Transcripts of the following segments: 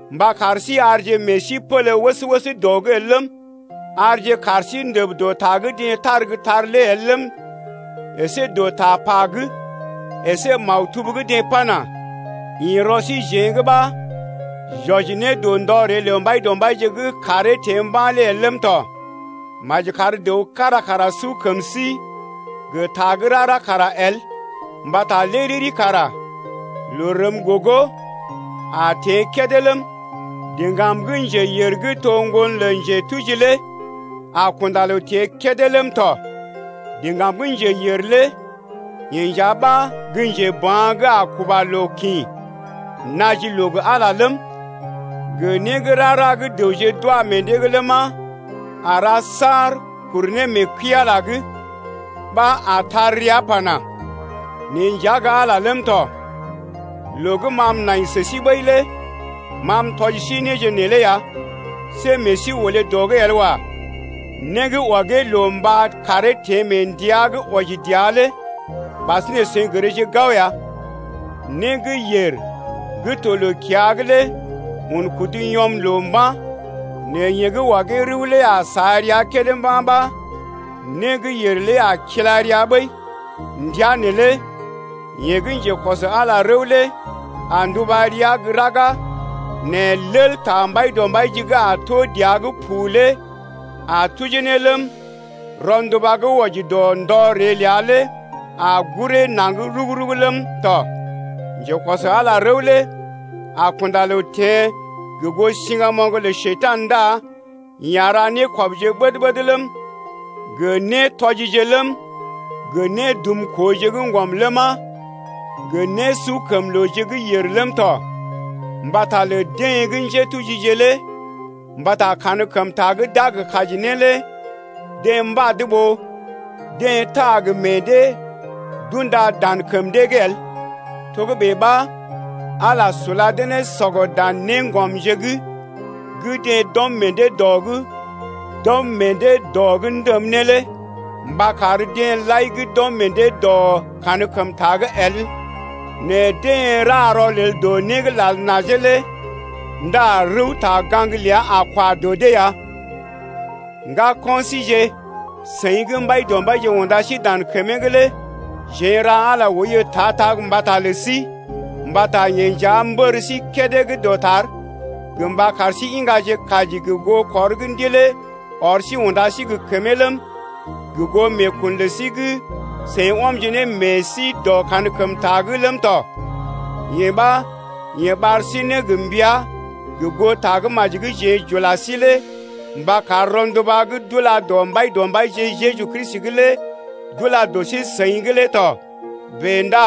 mba kar sí arje meḛ sí pélé wəs-wəs dɔ’g el ləm, arje kaar sí ndəb dɔ ta gə́ deḛ tar gə́ tar lé el ləm, əsé dɔ tapa’g, əsé maktub gə́ deḛ pana: Ḭ rɔ síjeḛ’g ɓa j’wɔji ne dɔ ndɔ ree lə Mbaidɔmbaije gə́ kàree teḛ mba̰ lé el ləm tɔ. Maji kar dəw kára kara su kəm sí gə ta gə́ rara kara el, mbata lé riri kara loo rəm gogo a teḛ kédé ləm, diŋgam gə́ njeyèr gə́ to ŋgon lə njetuji lé a kunda loo teḛ kédé ləm tɔ. Diŋgam gə́ njeyèr lé yeḛ nja ɓa gə́ njeba̰ gə́ a kuba loo kḭ naji loo gə Ala ləm, gə né gə́ rara gə́ dəwje d’wa meḛ dee’g ləma, a ra saar kuru ne mee kəi-Ala’g ɓa a tar rəa pana: Neḛ nja gə́ Ala ləm tɔ. Loo gə́ ma m’nai sə sí ɓəi lé ma m’tɔji sí néje neelé ya, see meḛ sí olé dɔ’g el wa. Né gə́ ɔgee loo mba karee teḛ mee ndəa gə́ wɔji dəa lé ɓasinè seḭ gərje gao ya. Né gə́ yèr gə́ to loo-kiya’g lé un kudu yɔm loo mba̰. Nɛ yeḛ gə́ ɔgee rəw lé a sa rəa kédé mba̰ ɓa, né gə́ yèr lé a kila rəa ɓəi. Ndəa neelé, yeḛ gə́ njekɔs Ala rəw lé a nduba rəa gə́ raga, nɛ lel ta Mbaidɔmbaije gə́ a tó dəa’g pu lé a tujee ne ləm, rɔnduba gə́ wɔji dɔ ndɔ ree ləa lé a guree naŋg rug-rug ləm tɔ. Njekɔs Ala rəw lé a kunda loo teḛ gə goo siŋgamoŋ lə Njekurai ndá yeḛ a ra nékɔbje ɓəd-ɓəd ləm, gə nétɔjije ləm, gə nédumkooje gə́ ŋgɔm ləma 0gə nésukəmlooje gə́ yèr ləm tɔ mbata lə deḛ gə́ njétujije lé mbata kankəmta gə́ d’a gə kaji ne lé deḛ mbad ɓó deḛ taa gə meḛ dee d’unda dan kəm dee’g el. Togə́bè ɓa Ala sula dee ne sɔgɔ dan néŋgɔmje’g gə́ deḛ d’ɔm meḛ dee dɔ’g ndəm ne lé mba kar deḛ lai gə́ d’ɔm meḛ dee dɔ kankəmta’g el nɛ deḛ ra rɔlel dɔ né gə́ lal najee lé ndá rəwta-gaŋg ləa a kwa dɔ dee ya. Ŋgako̰ síje, seḭ gə́ Mbaidɔmbaije unda sí dan kəmee’g lé jeḛ n’ra Ala oiyo ta-ta mbata lə sí mbata yeḛ nja mbər sí kédé gə́ dɔtar gə mba kar sí iŋgaje kaji gə goo kɔr gə́ Ndilee ɔr sí unda sí gə kəmee ləm, gə goo meekun lə sí gə́ seḭ ɔmje ne meḛ sí dɔ kankəmta’g ləm tɔ. Yee ɓa yeḛ ɓar sí ne gə mbəa gə goo Tagə́maji gə́ jeḛ j’ula sí lé mba kar rɔnduba gə́ d’ula dɔ Mbaidɔmbaije Jeju Kristi’g lé d’ula dɔ sí-seḭ’g lé tɔ. Bèe ndá,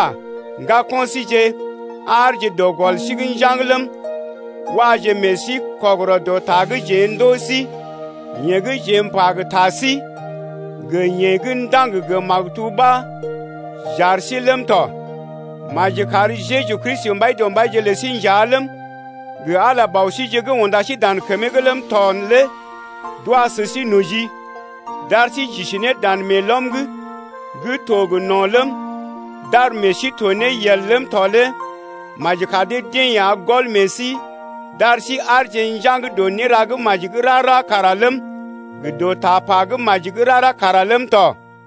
ŋgako̰ síje, aarje dɔ gɔl sí’g njaŋg ləm, waje meḛ sí kɔgərɔ dɔ ta gə́ jeḛ ndòo sí’g, yeḛ gə́ jeḛ m’pa gə ta sí gə yeḛ gə́ ndaŋg gə maktub ɓa j’ar sí lé ləm tɔ. Maji kar Jeju Kristi Mbaidɔmbaije lə sí nja ləm, gə Ala Bɔ síje gə́ unda sí dan kəmee’g ləm tɔ lé d’wa sə sí noji d’ar sí j’isi ne dan meelɔm’g gə́ to gə no̰ ləm, d’ar meḛ sí to ne yel ləm tɔ lé maji kar dee-deḛ ya gɔl meḛ sí d’ar sí aarje njaŋg dɔ néra gə́ maji gə́ rara kara ləm, gə dɔ tapa gə́ maji gə́ rara kara ləm tɔ.